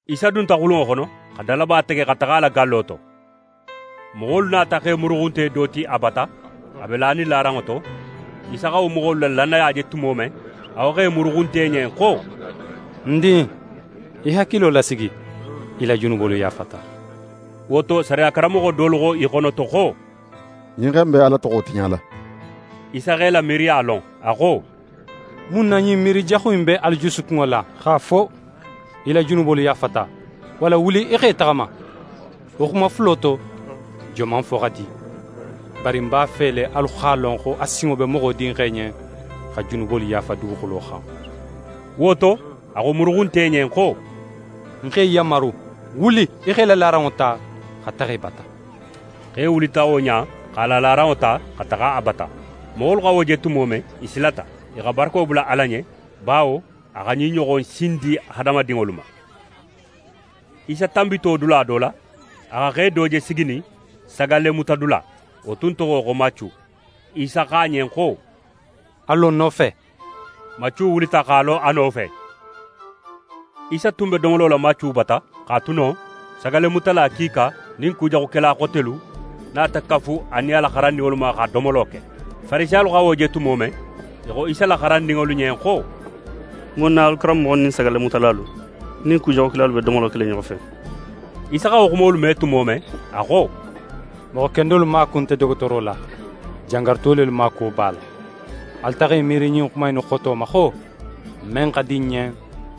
Isa dunta xulunŋo xono, xa dalaba tege xa taxa a la gallo to. Moxolu nata xe muruxunte do ti a bata, a be lanin laranŋo to. Isa xa wo moxolu la lannaya je tumo men, a xo xe muruxunte ɲen xo: «Ń din, í hakilo lasigi! Í la junubolu yaafata!» Wo to, sariya karanmoxo dolu xo i xonoto xo: «Ɲin xe in be Ala toxo tiɲala.» Isa x'e la miiriya lon, a xo: «Mun na ɲin miiri jaxu in be alu jusukunŋo la? X'a fo: “Í la junubolu yaafata,” walla: “Wuli, í x'é taxama.” Wo xuma fulo to, joman fo xa di? Bari ń b'a fe le alu x'a lon xo a sinŋo be Moxo Dinxe ɲen xa junubolu yaafa duguxulo xan.» Wo to, a xo muruxunte ɲen xo: «Ń x'é yanmaru, wuli, í x'é la laranŋo ta, xa taxa í bata!» Xe wulita wo ɲa in, x'a la laranŋo ta, xa taxa a bata. Moxolu xa wo je tumo men, i silata. I xa barako bula Ala ɲen, bawo a xa ɲin ɲoxon sin di hadamadinŋolu ma. Isa tanbito dula do la, a xa xe do je siginin sagallemutadula, wo tun toxo xo Macu. Isa xo a ɲen xo: «A lo ń nofe.» Macu wulita x'a lo a nofe. Isa tun be domolo la Macu bata; x'a tu non, sagallemutala kiika nin kujaxukela xotelu nata kafu a nin a la xarandinŋolu ma xa domolo ke. Farisiyalu xa wo je tumo men, i xo Isa la xarandinŋolu ɲen xo: «Mun na alu karanmoxo nin sagallemutalalu nin kujaxukelalu be domolo kela i ɲoxo fe?» Isa xa wo xumolu me tumo men, a xo: «Moxo kendolu maaku nte dogotooro la, jangaruto lelu maakuwo b'a la. Alu taxa i miiri ɲin xuma innu xoto ma xo: “Men xa di ń ɲen,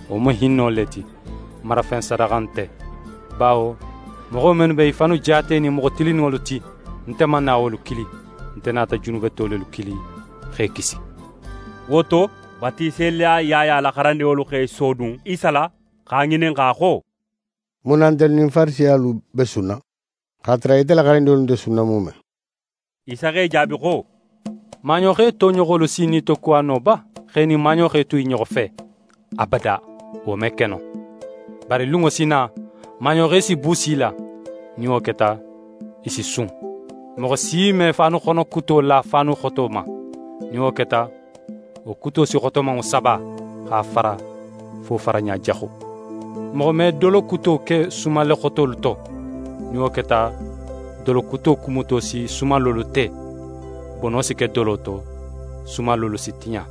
wo mu hinno le ti, marafen sadaxa nte.” Bawo moxo mennu be i fannu jaatenin moxo tilinninŋolu ti, nte man na wolu kili, nte nata junubeto lelu kili, x'e kisi.» Wo to, Batiselila Yaya la xarandinŋolu x'e sodun Isa la, x'a ŋininxa xo: «Mun na ntelu nin Farisiyalu be sunna, x'a tara ite la xarandinŋolu nte sunna muume?» Isa x'e jaabi xo: «Maaɲoxe toɲoxolu si nitokuwa no ba, x'e nin maaɲoxe tu i ɲoxo fe? Abada, wo me ke no. Bari lunŋo si na, maaɲoxe si buusi i la, nin wo keta, i si sun. «Moxo si me faanuxono kuto la faanu xoto ma. Nin wo keta, wo kuto si xotomanŋo saba, x'a fara fo faraɲa jaxu. Moxo me dolo kuto ke sumalle xotolu to. Nin wo keta, dolo kuto kumuto si sumallolu te; bono si ke dolo to, sumallolu si tiɲa.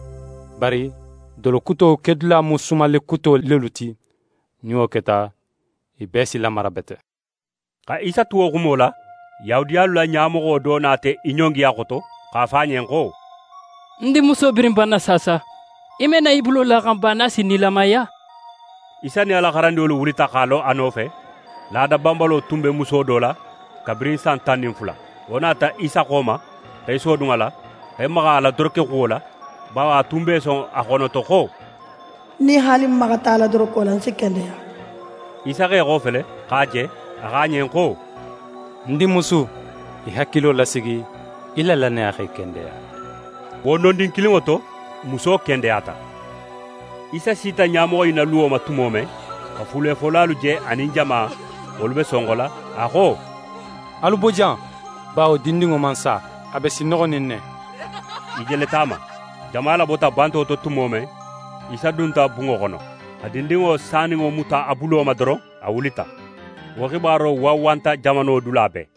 Bari, dolo kuto kedula mu sumalle kuto lelu ti. Nin wo keta, i bee si lamara bete.» Xa Isa tu wo xumo la, Yahudiyalu la ɲamoxo do nata í ɲongi a xoto, x'a fo a ɲen xo: «Ń dinmuso birin banna saasa. Í me na í bulo la a xan ba, nin a si nilamaya?» Isa nin a la xarandinŋolu wulita x'a lo a nofe. Laada banbalo tun be muso do la, kabirin san tan nin fula. Wo nata Isa xo ma, x'é sodun a la, x'é maxa a la dorokexuwo la. Bawo a tun be í son a xonoto xo: «Nin haali ń maxata a la doroko la, ń si kendeya.» Isa x'é xofele, x'a je, a xo a ɲen xo: «Ń dinmusu, í hakilo lasigi, í la lannaya x'é kendeya» Wo nondin kilinŋo to, muso kendeyata. Isa sita ɲamoxo in na luwo ma tumo men, xa fulefolalu je anin jama, wolu be sonxola, a xo: «Alu bo jan; bawo dindinŋo man sa. A be sinnoxonin ne.» I jeleta a ma. Jama labota banto to tumo men, Isa dunta bunŋo xono, xa dindinŋo saninŋo muta a bulo ma doron, a wulita. Wo xibaro wanwanta jamano dula bee.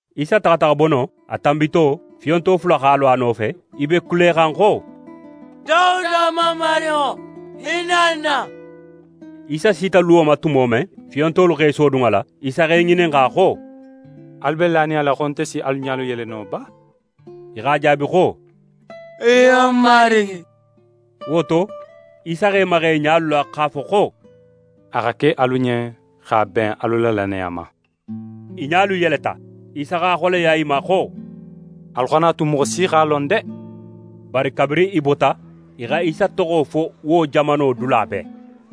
Isa taxata xa bo non, a tanbito, fiyonto fula x'a lo a nofe, i be kulexan xo: «Dawuda Mamarinŋo, hinna n na!» Isa sita luwo ma tumo men, fiyontolu x'e sodun a la, Isa x'e ŋininxa xo: «Alu be lanin a la xo nte si alu ɲalu yele no ba?» I x'a jaabi xo: «Iyo, Marigi.» Wo to, Isa x'é maxa i ɲalu la x'a fo xo: «A xa ke alu ɲen x'a ben alu la lannaya ma.» I ɲalu yeleta. Isa x'a xoleya i ma xo: «Alu xana a tu moxo si x'a lon de!» Bari, kabirin i bota, i xa Isa toxo fo wo jamano dula bee.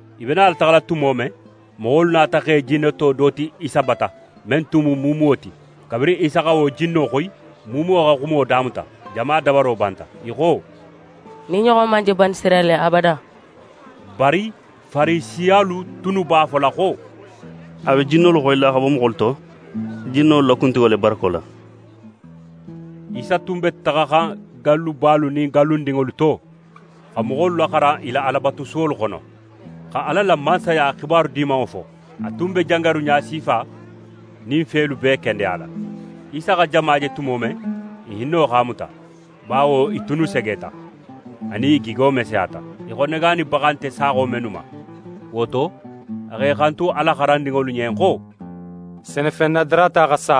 I be nala taxala tumo men, moxolu nata xe jinneto do ti Isa bata, men tun mu muumuwo ti. Kabirin Isa xa wo jinno xoyi, muumuwo xa xumo damuta. Jama dabaro banta. I xo: «Ɲin ɲoxon man je Banisirayila abada.» Bari Farisiyalu tunnu b'a fola xo: «A be jinnolu xoyila xa bo moxolu to jinnolu la kuntigo le barako la.» Isa tun be taxaxan gallubalu nin gallundinŋolu to, xa moxolu laxaran i la Alabatusuwolu xono, xa Ala la Mansaya xibaru Dimanŋo fo. A tun be jangaru ɲasifa nin felu bee kendeyala. Isa xa jama je tumo men, i hinno x'a muta; bawo i tunnu segeta, anin i gigo meseyata, í xo negaanibaxa nte saaxo mennu ma. Wo to, a x'é xantu a la xarandinŋolu ɲen xo: «Senefen nadarata xa sa,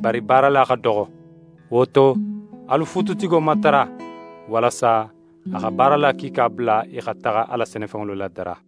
bari baarala xa doxo. Wo to, alu fuututigo matara, walasa a xa baarala kiika bula i xa taxa a la senefenŋolu ladara.»